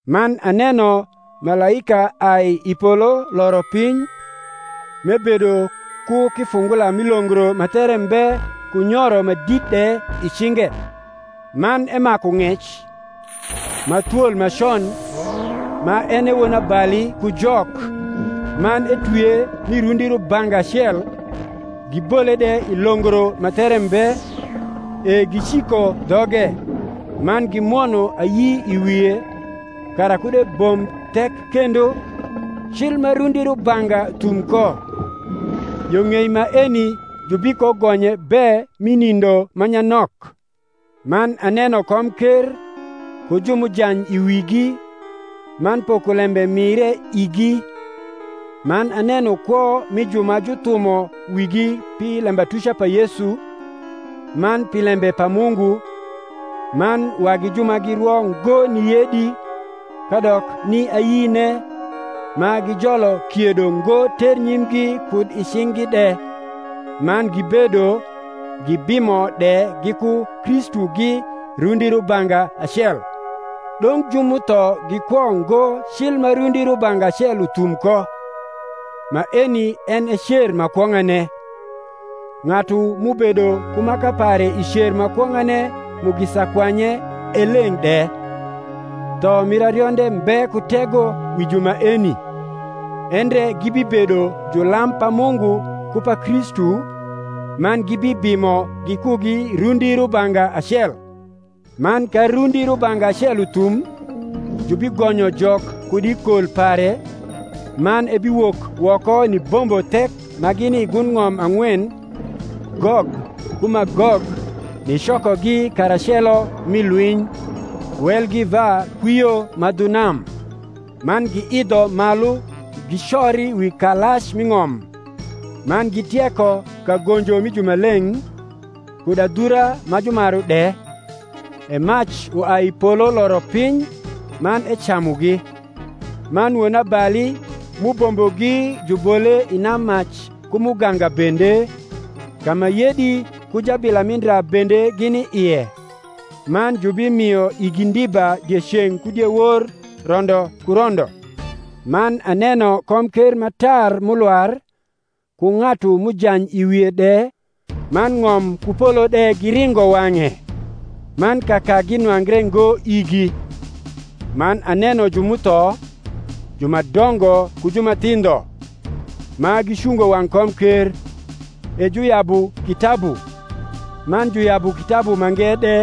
Man aneno malaika ai i polo loro piny, m’ebedo ku kifungula mi longro ma there mbe ku nyoro ma dit de i cinge. Man emaku ng’ec, ma thwol ma con, ma en e Wonabali ku Jok, man etwie mi rundi rubanga acel, gibole de i longro ma there mbe, e giciko dhoge, man gimwono ayi i wie, kara kud ebomb thek kendo, cil ma rundi rubanga thum ko: yo ng’ei maeni jubikogonye be mi nindo ma nyanok. Man aneno komker, ku ju m’ujany i wigi, man pokolembe mire igi: man aneno kwo mi ju ma juthumo wigi pi lembatuca pa Yesu, man pi lembe pa Mungu, man wagi ju ma girwo ngo ni yedi, kadok ni ayine, ma gijolo kiedo ngo ternyimgi kud i cing’gi de; man gibedo, gibimo de giku Kristugi rundi rubanga acel. Dong’ ju m’utho gikwo ngo cil ma rundi rubanga acel uthum ko. Maeni en e cer ma kwong’ane. Ng’atu m’ubedo ku maka pare i cer ma kwong’ane mugisa kwanye e leng’ de: tho mir arionde mbe ku tego wi ju maeni; endre gibibedo julam pa Mungu ku pa Kristu, man gibibimo gikugi rundi rubanga acel. Man ka rundi rubanga acel uthum, jubigonyo Jok kud i kol pare, man ebiwok woko nibombo thek ma gini i gund ng’om ang’wen, Gog ku Magog, nicokogi karacelo mi lwiny: welgi va kwio ma dhu nam. Man giidho malu gicori wi kalac mi ng’om, man gitieko kagonjo mi jumaleng’, kud adhura ma jumaru de: e mac uai i polo loro piny, man ecamugi. Man wonabali m’ubombogi jubole i nammac ku muganga bende, ka ma yedi ku jabila mi ndra bende gini ie; man jubimio igi ndiba dieceng’ ku diewor rondo ku rondo. Man aneno komker ma tar m’ulwar, ku ng’atu m’ujany i wie de, man ng’om ku polo de giringo wang’e; man kakagi nwangre ngo igi. Man aneno ju m’utho, ju ma dongo ku ju ma thindho, ma gicungo wang’ komker; e juyabu kitabu: man juyabu kitabu mange de,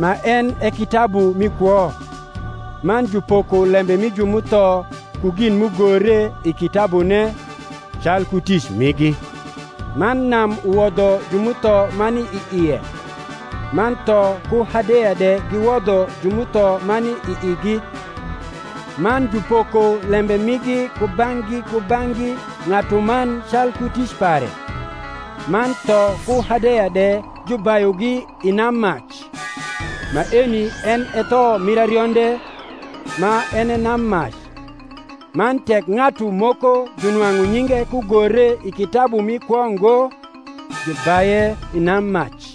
ma en e kitabu mi kwo: man jupoko lembe mi ju m’utho ku gin m’ugore i kitabune, calku tic migi. Man nam uwodho ju m’utho ma ni i ie: man tho ku Hadeya de giwodho ju m’utho ma ni i igi: man jupoko lembe migi kubang’gi kubang’gi ng’atuman calku tic pare. Man tho ku Hadeya de jubayugi i nammac. Maeni en e tho mir arionde, ma en e nammac. Man tek ng’atu moko junwang’u nyinge kugore i kitabu mi kwo ngo, jubaye i nammac.